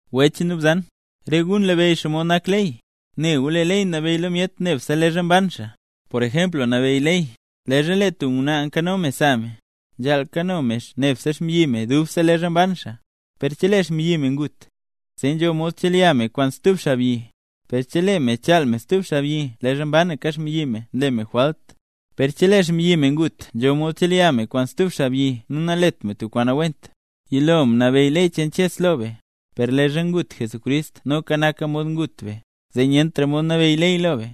Wech nu bzan, re gu nlabeyy xomod nak ley. Ne gu lee ley nabeyy lo myet nebse leezha mban xaa. Por ejempl nabeyy ley, leezha lee tub ngwnaa nkano me sa me, nzhaal kano me nebse xmbyi me dubse leezha mban xaa. Per chelee xmbyi me ngut, zee nzho mod chelya me kwaan stub xaabyi. Per chelee me nchaal me stub xaabyi leezha mbanaka xmbyi me nle me jwalt. Per chelee xmbyi me ngut, nzho mod chelya me kwaan stub xaabyi nu nalet me tub kwaan nawent. Yilo mnabeyy ley cheen Dios lo be; per leezha ngut Jesucrist noka naka mod ngut be; zee nyentra mod nabeyy ley lo be.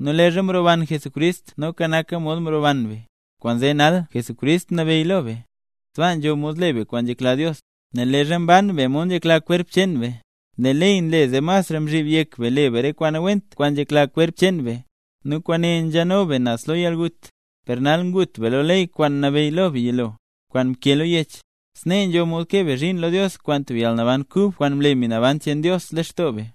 Nu leezha mroban Jesucrist noka naka mod mroban be, kwaanzee nal Jesucrist nabeyy lo be, sbaa nzho mod le be kwaan nzhekla Dios. Nel leezha mban be mod nzhekla kwerp cheen be, lee ley nle zee masra mzhib yek be le be re kwaan nawent kwaan nzhekla kwerp cheen be. Nu kwaane nzheno be naz lo yalgut. Per nal, ngut be lo ley kwaan mnabeyy lo be yilo, kwaan mkee lo yech; snee nzho mod kee be zhiin lo Dios kwaan tub yalnaban kub, kwaan mle Mbi Naban cheen Dios lextoo be.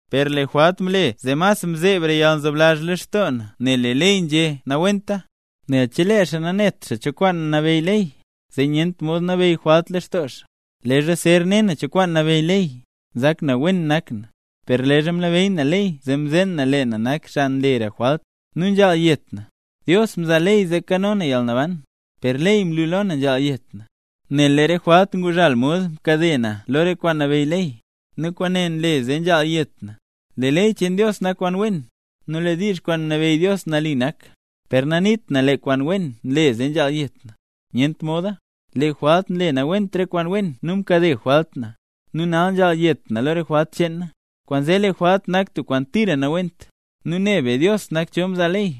Per lee jwalt mle zee mas mzebra yalnzoblazh lextoo na nel lee ley nzhé nawenta. Nel chelee xaa nanet xaa cho kwaan nabeyy ley, zee nyent mod nabeyy jwalt lextoo xaa. Leezha zer ne na cho kwaan nabeyy ley, nzak na wen nak na, per leezha mlabeyy na ley zee mzeen na lee na nak xaa nlera re jwalt, nu nzhaal yet na. Dios mzaa ley zee kano na yalnaban, per ley mlu lo na nzhaal yet na. Nel lee re jwalt nguzhal mod mkade na lo re kwaan nabeyy ley, nu kwaane nle zee nzhaal yet na. Lee ley cheen Dios nak kwaan wen; nu lee diizh kwaan mnabeyy Dios nali nak. Per naniit na lee kwaan wen ne nle zee nzhaal yet na. ¡Nyent moda! Lee jwalt nle nawent re kwaan wen nu mkade jwalt na, nu nal nzhaal yet na lo re jwalt cheen na. ¡Kwaanzee lee jwalt nak tub kwaan tira nawent! Nu ne be Dios nak cho mzaa ley,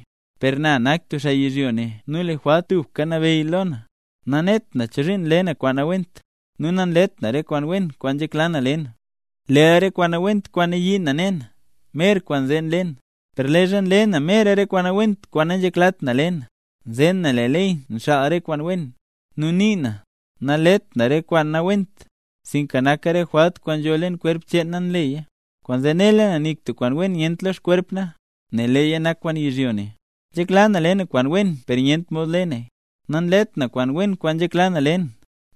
per na nak tub xaa yizhyo ne nu lee jwalt tubka nabeyy lo na. Nanet na chozhiin nle na kwaan nawent, nu nanlet na re kwaan wen kwaan nzhekla na le na, leel re kwaan nawent kwaan nayii na ne na, mer kwaan zee nle na. Per leezha nle na mer re kwaan nawent kwaan nanzheklat na le na, nzeen na lee ley nxaal re kwaan wen. Nu nii na, naleet na nle na re kwaan nawent, sinka naka re jwalt kwaan nzho leen kwerp cheen na nleya. Kwaanzee nela na nik tub kwaan wen nyent lo xkwerp na, nel leeya nak kwaan yizhyo ne. Nzhekla na le na kwaan wen per nyent mod le naya. Nanlet na kwaan wen kwaan nzhekla na le na,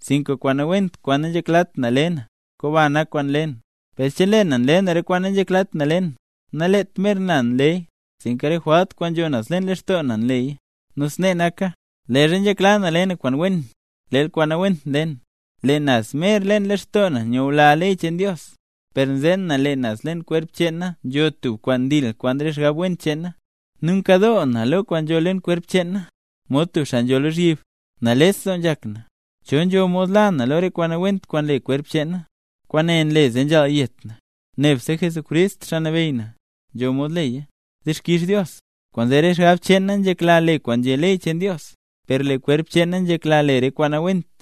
sinka kwaan nawent kwaan nanzheklat na le na, komba nak kwaan nle na. Per chelee na nle na re kwaan nanzheklat na le na, naleet mer na nleya, sinka re jwalt kwaan nzho naz leen lextoo na nleya. Nu snee naka, leezha nzhekla na le na kwaan wen, leel kwaan nawent nle na. Lee naz mer leen lextoo na nyula na ley cheen Dios, per nzeen na, lee naz leen kwerp cheen na nzho tub kwaan ndil kwaan re xgab wen cheen na. Nu nkadoo na lo kwaan nzho leen kwerp cheen na, mod tub xaa nzho lozhyib. ¡Nales doo nzhak na! ¿Cho nzho mod la na lo re kwaan nawent kwaan nle kwerp cheen na? Kwaane nle zee nzhaal yet na. Nebse Jesucrist, Xaa Nabeyy na, nzho mod leya. ¡Dixkix Dios! Kwaanzee re xgab cheen na nzhekla le kwaan nzhé ley cheen Dios, per lee kwerp cheen na nzhekla le re kwaan nawent.